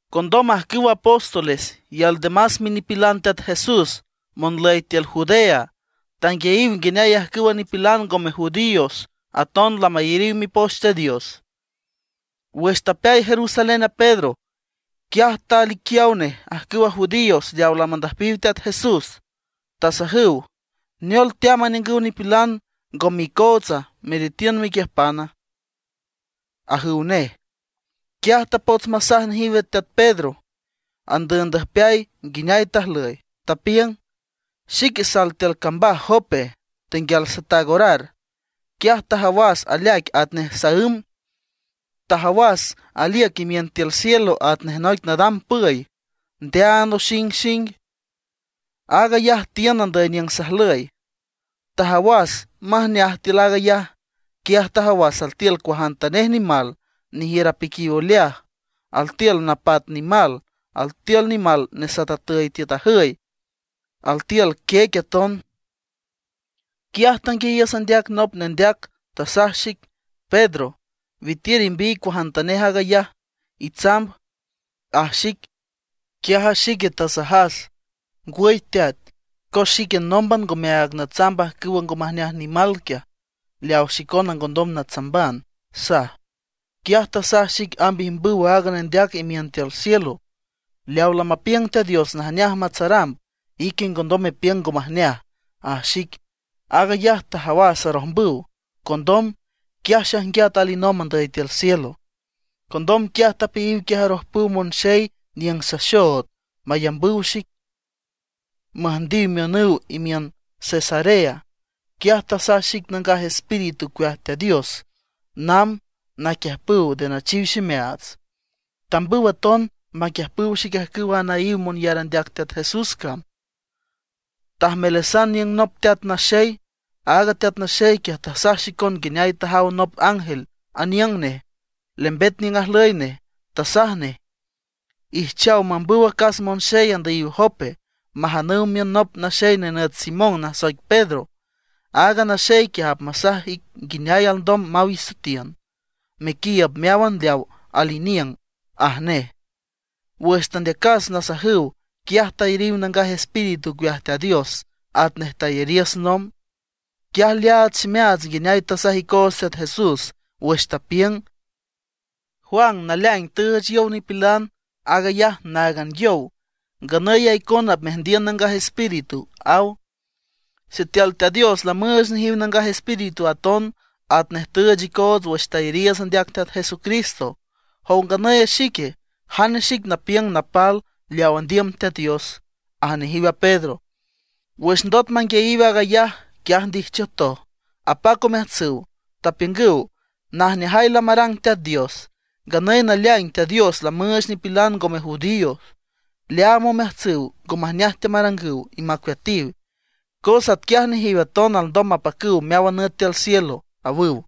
Condom ajcüw apóstoles y aldemas minipilan Teat Jesús monlüy tiül Judea tanguiayiw nguineay ajcüwa nipilan ngome judíos aton lamayariw Mipoch Teat Dios. Wüx tapeay Jerusalén a Pedro, quiaj taliquiaw nej ajcüwa judíos leaw lamandüjpiw Teat Jesús. Tasajüw: ―¿Neol teamb aniüngüw nipilan ngome icootsa meretiün mequiüjpana? ―ajüw nej. Quiaj tapots masaj nejiw a teat Pedro andüübndüjpeay nguineay tajlüy, tapiüng: ―Xique sal tiül cambaj Jope, tenguial sataag orar. Quiaj tajawas aleaic atnej saǘm. Tajawas aliüc imiün tiül cielo atnej noic nadam püy, ndeaan oxingxing; aag ayaj tiün andüy niüng sajlüy. Tajawas majneaj tiül aag ayaj. Quiaj tajawas altiül cuajantanej nimal nejiür apiquiw oleaj; altiül napat nimal, altiül nimal nesatatüy tiüt ajüy, altiül quiec aton. Quiaj tanguiayiüs andeac nop nendeac, tasaj xic: “Pedro, witiür imbiy cuajantanej aag ayaj, itsamb”, aj xic. Quiaj a xique tasajas: “Ngwüy Teat, cos xique nómban ngomeaag natsamb ajcüwa ngo majneaj nimal quiaj, leaw xicona ngondom natsamban”, saj. Quiaj tasaj xic amb ijmbüw aaga nendeac imiün tiül cielo: “Leaw lamapiüng Teat Dios najneaj matsaramb, ique ngondom mepiüng ngo majneaj”, aj xic. Aag ayaj tajawas arojmbüw. Condom, quiaj xaijnguiat alinomb andüy tiül cielo. Condom, quiaj tapeayiw quiaj arojpüw monxey niüng saxood mayambüw xic, müjndiw miünüw imiün Cesarea. Quiaj tasaj xic a Nangaj Espíritu ocueaj Teat Dios namb naquiüjpüw nde nachiw ximeaats. Tambüw aton maquiüjpüw xic ajcüwa anaíw monyar andeac Teat Jesús cam. Tajmelasan aniüng nop teat naxey. Aaga teat naxey quiaj tasaj xicon nguineay tajaw nop ángel aniüng nej, lembet niüng ajlüy nej, tasaj nej: “Ijchaw mambüw acas monxey andüyiw Jope, majanüw miün nop naxey nenüt Simón, nasoic Pedro. Aaga naxey quiaj apmasaj ic nguineay alndom maw isoetiün, mequiiüb meáwan leaw al iniüng”, aj nej. Wüx tandeacas nasajüw, quiaj tayariw Nangaj Espíritu ocueaj Teat Dios atnej tayariiüts nomb. Quiaj leaad ximeaats nguineay tasaj icoots Teat Jesús wüx tapiüng: “Juan naleaing tüüch yow nipilan, aag ayaj náagan yow. Nganüy a icona apmeajndiün Nangaj Espíritu”, aw. Sitiül Teat Dios lamüüch nejiw Nangaj Espíritu aton, atnej tüüch icoots wüx tayariiüts andeac Teat Jesucristo ¿jow nganüy a xique, jane xic napiüng napal leaw andiüm Teat Dios? ―aj nejiw a Pedro. Wüx ndot manguiayiw aag ayaj, quiaj ndijchiütoj, apac omeajtsüw, tapiüngüw: ―¡Najneajay lamarang Teat Dios! Nganüy naleaing Teat Dios lamüüch nipilan ngome judíos leaam omeajtsüw ngo majneaj teamarangüw y macueatiw, cos atquiaj nejiw aton alndom mapacüw meáwan nüt tiül cielo ―awüw.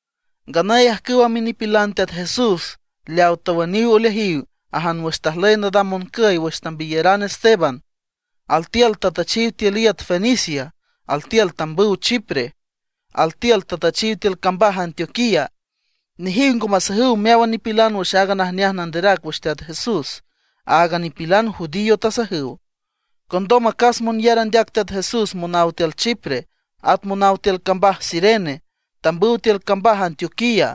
Nganüy ajcüwa minipilan Teat Jesús leawa tawüniw oleajiw ajan wüx tajlüy nadam moncüy wüx tambiyaran Esteban, altiül tatüchiw tiül iüt Fenicia; altiül tambüw Chipre; altiül tatüchiw tiül cambaj Antioquía. Nejiw ngo masajüw meáwan nipilan wüx aaga najneaj nanderac wüx Teat Jesús, áagan nipilan judío tasajüw. Condom acas monyar andeac Teat Jesús monaw tiül Chipre, at monaw tiül cambaj Cirene, tambüw tiül cambaj Antioquía.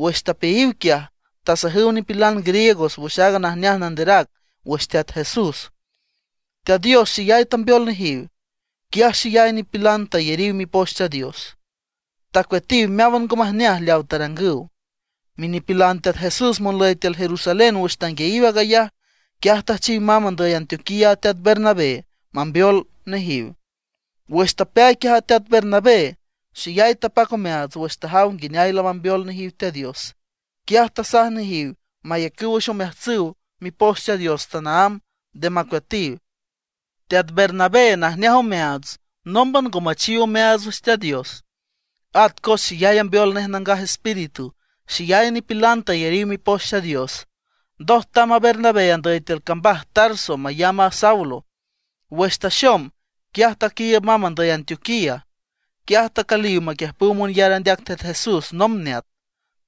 Wüx tapeayiw quiaj, tasajüw nipilan griegos wüx aaga najneaj nanderac wüx Teat Jesús. Teat Dios xeyay tambeol nejiw; quiaj xeyay nipilan tayariw Mipoch Teat Dios, tacueatiw meáwan ngo majneaj leawa tarangüw. Minipilan Teat Jesús monlüy tiül Jerusalén wüx tanguiayiw aag ayaj, quiaj tüjchiw mamb andüy Antioquía a teat Bernabé mamb mambeol nejiw. Wüx tapeay quiaj a teat Bernabé, xeyay tapac omeaats wüx tajaw nguineay lamambeol nejiw Teat Dios. Quiaj tasaj nejiw mayacüw wüx omeajtsüw Mipoch Teat Dios tanaámb, nde macueatiw. Teat Bernabé najneaj omeaats, nómban ngo machiw omeaats wüx Teat Dios. At cos xeyay ambeol nej Nangaj Espíritu, xeyay nipilan tayariw Mipoch Teat Dios. Ndoj tamb a Bernabé andüy tiül cambaj Tarso mayamb a Saulo. Wüx taxom, quiaj taquiiüb mamb andüy Antioquía. Quiaj tacüliw maquiüjpüw monyar andeac Teat Jesús nomb neat;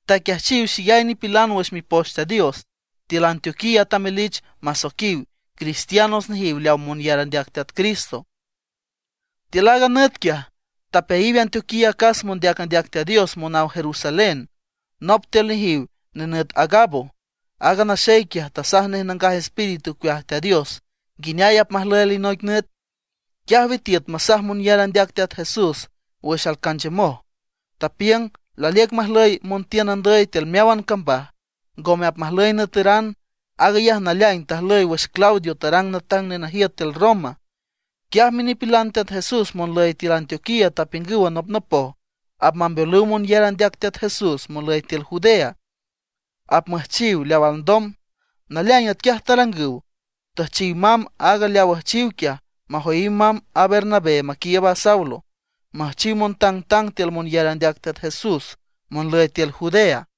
taquiajchiw xeyay nipilan wüx Mipoch Teat Dios. Tiül Antioquía tamelich masoiquiw Cristiano nejiw leaw monyar andeac Teat Cristo. Tiül aaga nüt quiaj, tapeayiw Antioquía acas mondeac andeac Teat Dios monaw Jerusalén. Nop tiül nejiw nenüt Agabo. Aaga naxey quiaj tasaj nej Nangaj Espíritu ocueaj Teat Dios nguineay apmajlüy alinoic nüt. Quiaj witiüt masaj monyar andeac Teat Jesús wüx alcanchiümoj; tapiüng laliüc majlüy montiün andüy tiül meáwan cambaj, ngome apmajlüy nüeteran. Aag ayaj naleaing tajlüy wüx Claudio tarang natang nenajiüt tiül Roma. Quiaj minipilan Teat Jesús monlüy tiül Antioquía tapiüngüw anopnopoj apmambeolüw monyar andeac Teat Jesús monlüy tiül Judea; apmüjchiw leaw alndom. Naleaing atquiaj tarangüw, tüjchiw mamb aaga leaw üjchiw quiaj majoyiw mamb a Bernabé maquiiüb a Saulo, müjchiw montangtang tiül monyar andeac Teat Jesús monlüy tiül Judea.